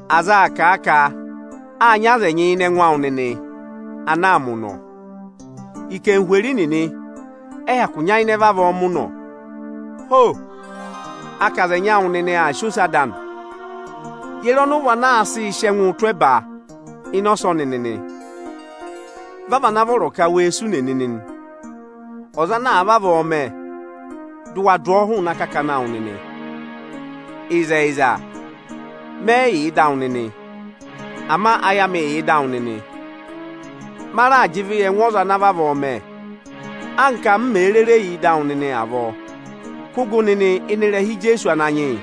Aza aa kà a ka áa nyị aza ẹnyị ịnị ẹngụ awụ nịnị ana aa mẹ ụnọ. Ikenhweri nịnị ẹ yị hyakụ nyayịnẹ vavọọ mẹ ụnọ. Ho! A ka aza ẹnyị awụ nịnị aa sị ose ada anị. Ye re ọnị ụ vị ana aa sịị sị ẹngụụ tụ́ ẹba ịnị ọsọnị nịnị? Vị a vị ana vọrọ ka wee sụ ùnè nịnị nị! Ọza ana àa vavọọ mẹ, dị ụ wa dụ ọọ hụụnị akakana awụ nịnị! Ịzẹyịza, mẹ yị yà ịdị awụ nịnị, ama ayị amị yà ịda awụ nịnị. Ma raà jị ịvị yị ẹngụ ọza ana vavọọ mẹ, anka m mèe rere yà ịdị awụ nịnị avọọ. Kụ́ gụ nịnị ịnị ịrẹha Ijeesu Ananyị yị,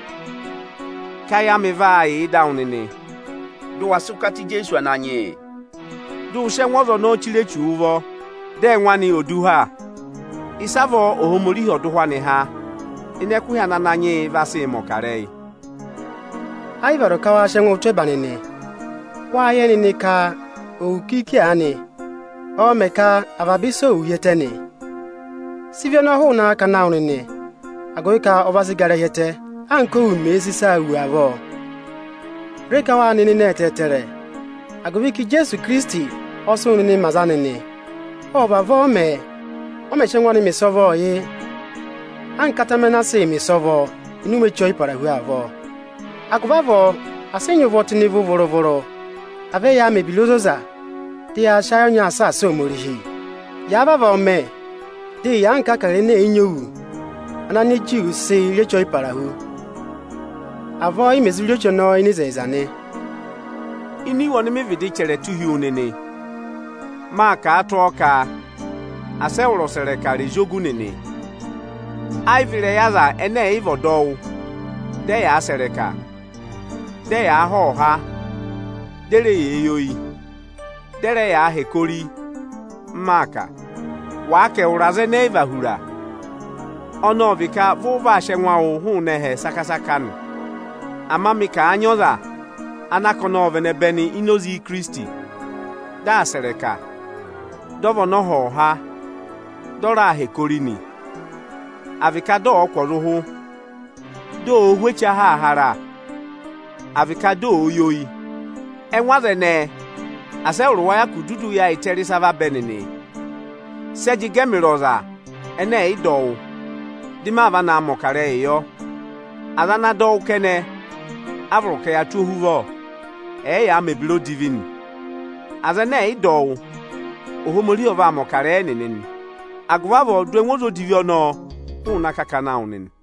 ka ayị amị vaa yà ịdị awụ nịnị, dị ụ wa sị ụkata Ijeesu Ananyị yị, dị ụ sị ẹngụ ọza ọnọọ chire Echuu ụvọ, dị ẹngụ anị ò du ha, ịsavọọ Ohomorihi ọ̀ dọ ụhwẹ anị há ịnị ẹkụhị ana Ananyị yị vaa sị mẹ̀ ọkarẹyị. Ẹ yị vọrọ ka waa sị ẹngụụ tụ́ ẹba nịnị. Wáá yẹ nịnị ka òwù kiiki aanị, ọọ̄ mẹ̀ ka avaba ịsa ò wù hi ẹtẹ nị? Sị ịvị ọnọọ hụụnị akakana awụ nịnị, agụvị ka ọ va sị gara hi ẹtẹ, anka òwù mẹ̀ẹ̄ sị ịsaa wù avọọ! Re ka wáa nị nịnị ẹtẹẹtẹrẹ, agụvị ka Ijeesu Ikirisiti ọ sị wụ nịnị mẹ aza ana nị! Ộ vavọọ mẹẹ, ọ mẹ̀ sị ẹngụ anị mẹ ịsọvọọ yị anka atẹmẹ ana a sịị̄ mẹ̀ ịsọvọ ịnị ụmẹ Eche Ọyịparahu avọọ. Agụvị avọọ asị ị nyị ụvọ tụ́ ịnị ịvị vụrụ-vụrụ! À vẹ yaa mẹ̀ ebira ozoza, dị yaa sị ayị ọnyaa saasa Ohomorihi! Yàa vavọọ mẹ, dị ị yà anka Ịbụrẹẹdị ẹnẹ ẹ̀yị nyị òwù (ana Anijuū sịị rị Eche Ọyịparahu). Avọọ ị mẹ̀ zụ rị eche ọnọọ ịnị ịzẹyịza nị. Ini iwe ọnị mị vịdị chẹrẹ tụ́ hi wu nịnị, mâ kà a tụ́ ọọ ka asị ẹwụrị ọsẹrẹka rẹ̀ zị ògù nịnị. Ẹ yị vị ịrẹyị aza ẹnẹ ẹ̀ yị vị ọdọwụ, dị ẹyaa sẹ̀ ịrẹka, dị ẹyaa há ọhọha, dị e re yee yi oyi, dị ẹ rẹ yaa hẹkẹ ori, m maa kà. Wàa ka ẹwụrị aza ẹnẹẹ ẹ yị va hura, ọnị ọ vị ka vị ụ vaa sị ẹngụ awụụ hụụnị ẹhẹ saka-saka nị. Ama mị ka àa nyị ọza ana ka ọnị vị ẹnẹbẹnị ini oze Ikirisiti, dị aa sẹ̀ ịrẹka, dị ọ vị ọnọhọha, dị ọ raa hẹkẹ ori nị, à vị ka dị ọ̀ọ kụ̀ ọza ụhụ, dị òo hú eche ahaahara, àa vị ka dị òo yi oyi, ẹngụ aza ẹnẹẹ asị ẹwụrị wa hyakụ dudu yaayịtẹ rị ịsa vabẹ nịnị! Sị ẹ jị gẹ ẹmịrị ọza ẹnẹ ẹ̀ yị dọ wụ́, dị ma va naa mẹ̀ ọkarẹyị yọ? Aza ana dọ wụ́ kẹnẹ, a vọrọ ka yaa tụ́ ohuvọ, ẹ̀ẹ yaa mẹ̀ ebira odivi nị. Aza ẹnẹ ẹ̀ yị dọ wụ́, Ohomorihi ọ vaa mẹ̀ ọkarẹyị ẹnịnị nị. Agụvị avọọ dụ ẹngụ ọza odivi ọnọọ hụụnị akakana awụ nịnị.